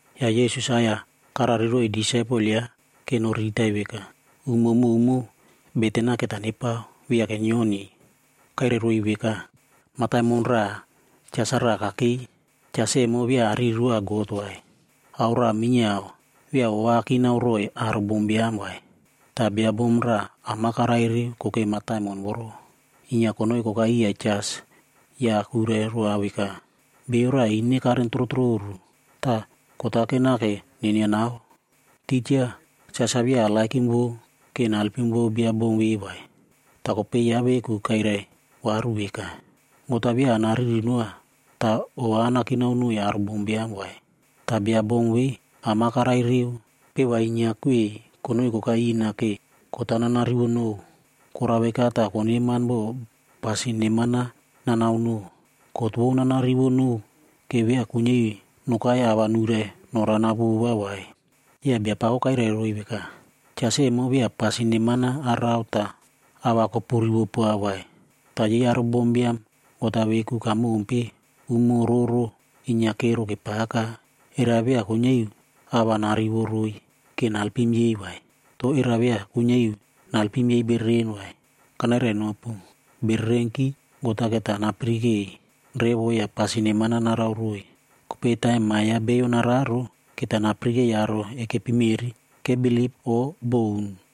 Ya Yesus-a aꞌai-ya karariroiy disaipel yaꞌa ke noriritai veka, umo mowmow beten-a keta nepao, viake nyioniy. Kairairoiy veka, “Mataimon raꞌa, jas-a raꞌa kakei. Jas emo via ariri roa God vai, ao raꞌa minyiao, via ova akinao roiy aro bombiam vai. Ta bia bom raꞌa am-a karai reu kokei mataimon voro. Inyia konoi kokai iya jas ya kuirai roa veka, ‘Beiyo raꞌa ine karen trotroru, ta kot-a kenake nenianao.’ “Tija, jas-a via arererow ke nalpim vou bia bom ve vai. Ta kopei yaꞌa veku kairai varu veka, ‘God-a via anariri noa ta ova anakinao noiy aro bombiam vai. Ta bia bom ve am-a karai reu, peva inyia kwei konoi kokai ina ke kot-a nanarivo nou. Korao veka ta koneman bo pasin neman-a nanao nou. Kot vou nana rivo nou ke via kuinyia iu nokai a va nuirai norana vova vai.’” Ya Biapako kairai roiy veka, “Jas emo via pasin neman-a arao ta a va kopurivo poa vai. Ta yei aro bombiam God-a veku kamompe, umo roro inyia kero kepaka. Era via kuinyia iu a va narivo roiy ke nalpim yei vai? To era via kuinyia iu naelpim yei bereren vai? Kanairainopu, bererenki, God-a keta napirikei revo ya pasin neman-a narao roiy. Kopei taim Ma ya Bio nararo, keta napirikei aro ekepi meꞌri kebilip o boun?”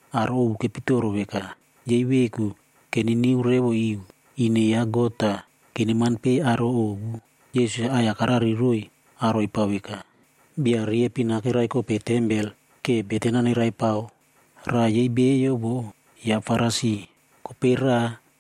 Aro ovu kepitoro veka, yei veku keniniu revo iu ine ya God ta keneman pei aro ovu. Yesus-a aꞌai-ya karariroiy aro epao veka. “Bia riepin-a kerai kope tempel ke beten-a neraipao. Raꞌa yei bio vo, yaꞌa Farisi, kopei raꞌa,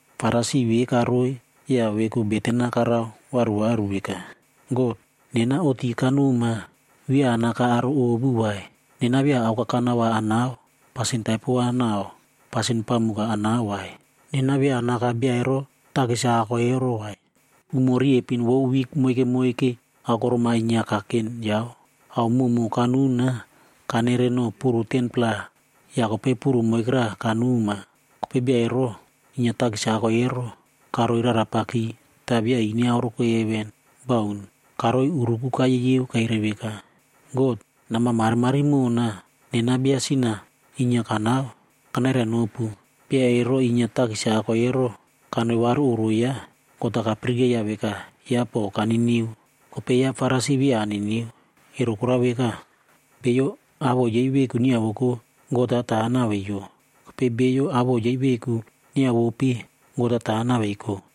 Farisi ve karoi ya veku beten-a karao varu varu veka, ‘God, nena oꞌti kanoma, via anaka aro ovu vai. Nena via aokakana va anao, pasin taipo va nau pasin pamuk-a anao vai. Nena via anaka bia ero takis-a ako ero vai. Umo riepin vou wik moike moike aokorom-a inyia kaken yao. Ao mowmow kanuna, kanere nou puru 10-pla ya kopei puru moikera kanoma.’ “Kopei bia ero inyia takis-a ako ero, karoi rarapaki ta via ine aoreko heven, baun! Karoi uruku kayeyeub kairai veka, ‘God nama marimari mona. Nena bia sin-a inyia kanao.’ “Kanairainopu, bia ero inyia takis-a ako ero kanoi varu oꞌro yaꞌa, God-a kapirikeiya veka yaꞌa po kaniniu. Kopei yaꞌa Farisi via aniniu. Ero korao veka, beiyo awoꞌo yei veku nyiavoko, God-a ta naweiyo. Kopei beiyo awoꞌo yei veku nyiavope, God-a ta naweiko.”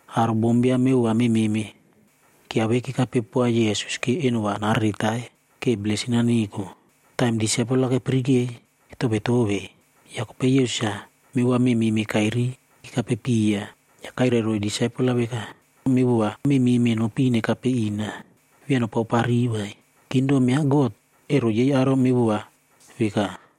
Aro bombiam mevova mememe kyiavei kekape poa Yesus ke eno va nareretai ke blesin-a neko. Taim disaipel-a kepirikei, Ya kopei Yesus-a mevova mememe kairiy kekapepiya, ya kairai roiy disaipel-a veka, “Mevova mememe nopin nekape ina, via nopaopariy vai. Kingdom ya God, ero yei aro mevova veka.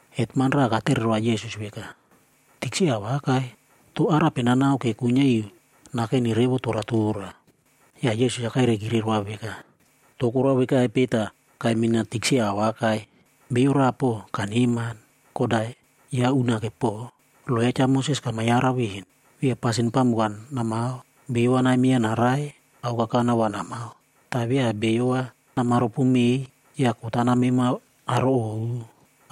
Hetman raꞌa katere roa Yesus veka, “Tikse awakai, to arape nanao ke kuinyia iu nakeni revo toratora?” Ya Yesus-a kairaikire roa veka, “To korao vekaipe ta kaimina tikse awakai? Beiyo raꞌa po kaneman. God-a yaꞌa unake po. Lo ya Cha Moses kama yarau ven, Via pasin pamuk-a namao, beiyo va naimyeiya narai, aokakana va namao. Ta via beiyo va nama ropomei ya kot-a nameimao aro ovu.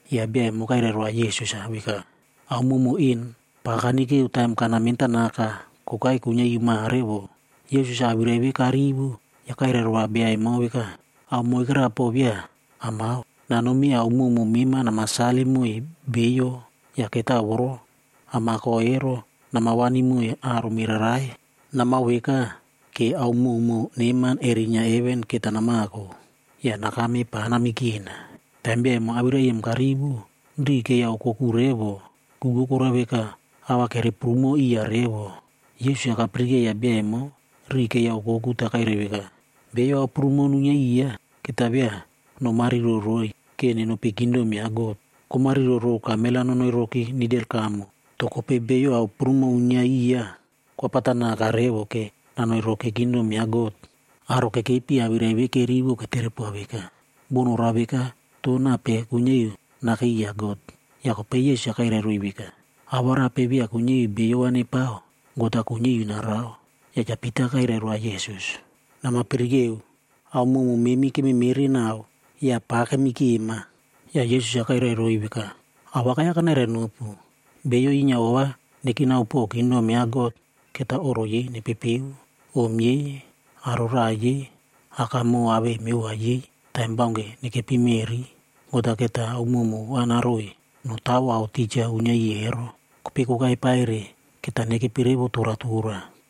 Ya bia emo kairai roa Yesus-a veka, “Ao mowmow en pa kanikeo taim kana mentanaka kokai kuinyia iu mare vo.” Yesus-a awirai ve karivo, ya kairai roa bia emo veka, “Ao moikera po via amao. Nanomi ao mowmow mema nama salim moiy beiyo ya ketao voro amako ero nama wani moiy aro mererai. Namao veka, ke ao mowmow neman erinyia heven keta namako. Ya nakame pa namikena.” Taim bia emo awirai em karivo, riꞌi keiya okoku revo. Ku vou korao veka, ao va kere prumo iya revo. Yesus-a kapirikeiya bia emo riꞌi keiya okoku ta kairai veka, “Beiyo ao prumo nuinyia iꞌiy, keta via nomariro roiy ke nenopi kingdom ya God. Komariro row kamel-ae nonoi roki nidel kamo, to kopei bio ao prumo uinyia iya, kwapata naka revo ke nanoi roki kingdom ya God.” Aro kekepi awirai ve kerivo ketere poa veka, “Bo norao veka, to nape kuinyia iu nakei iya God?” Ya kopei Yesus-a kairai roiy veka, “Awarape via kuinyia iu beiyo va nepao, God-a kuinyia iu narao.” Ya Cha Pita kairai roa Yesus, “Nama pirikeo. Ao mowmow memi kememere nau ya pa kemikema.” Ya Yesus-a kairai roiy veka, “Awakai-ya kanairai nopu, beiyo inyia ova nekinao po kingdom ya God, keta oꞌro yei nepepeo, om yei, aro raꞌai yei, akamoꞌo awei mevova yei, taim baunke nekepi meꞌri, God-a keta ao mowmow va naroiy notawo ao tija uinyia iꞌiy ero. Kopei kokai paire, keta nekepi revo toratora.”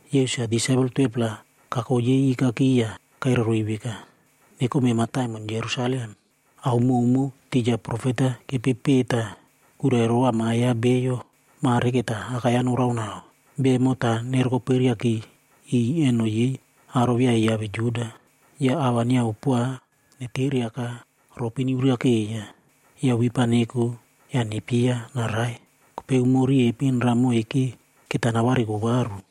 Yesus-a disaipel 12-pla kako yei ikaki ya kairai roiy veka, “Nekome mataimon Jerusalem. Ao mowmow tija profet-a kepepeꞌe ta kuirai rova Ma ya Bio, mare keta akai-ya noraonao. Bia emo ta nerokoperiaki iꞌiy eno yei aro via yiave Juda.f Ya a va nyiavo poa, neteriaka, ropi nyiurakeiya. Ya wip-a neko ya nepyeiya narai. Kopei umo riepin raꞌa moike keta navariko varu.”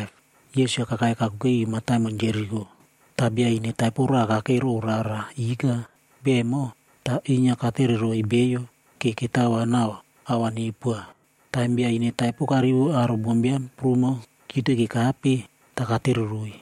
Yesus-a kakai kakuke iu mataimon Jeriko, ta bia ine taipo raꞌa kakei row rara ika. Bia emo, ta inyia katereroiy beiyo ke ketao va nau ao va neupoa. Taim bia ine taipo karivo aro bombiam prumo kyiute kekape, ta katereroiy,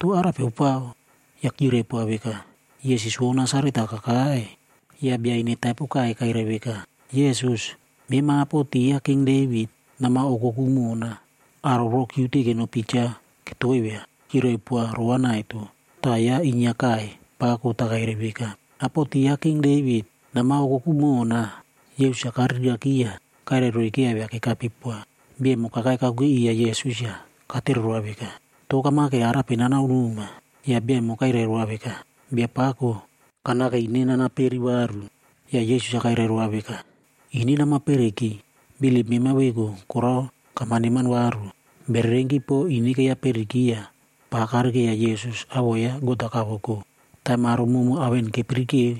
“To arape opao?” Ya kyirai poa veka, “Yesus vou Nasaret-a kakai.” Ya bia ine taipo kaiy kairai veka, “Yesus, mema apoti ya King Devit,g nama okoku mona.” Aro voro kyiute kenopi cha ketoivia, kyirai poa rova naito. Ta yaꞌa inyia kaiy pako ta kairai veka, “Apo ti ya King Devit, nama okoku mona.” Yesus-a kariraki ya kairai roiy kyiaivia kekape poa. Bia emo kakai kakuke iya Yesus ya katere roa veka, “To kamake arape nanaonoma?” Ya bia emo kairai roa veka, “Biapako, kanake ine nana peri varu.” Ya Yesus-a kairai roa veka, “Ine nama periki. Bilip mema veku korao kama neman varu.” Bererenki po ine keiya periki ya pa karikeiya Yesus awoꞌo ya God-a kavoko. Taim aro mowmow ao en kepirikeo,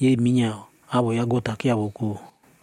yei minyiao awoꞌo ya God-a kyiavoko.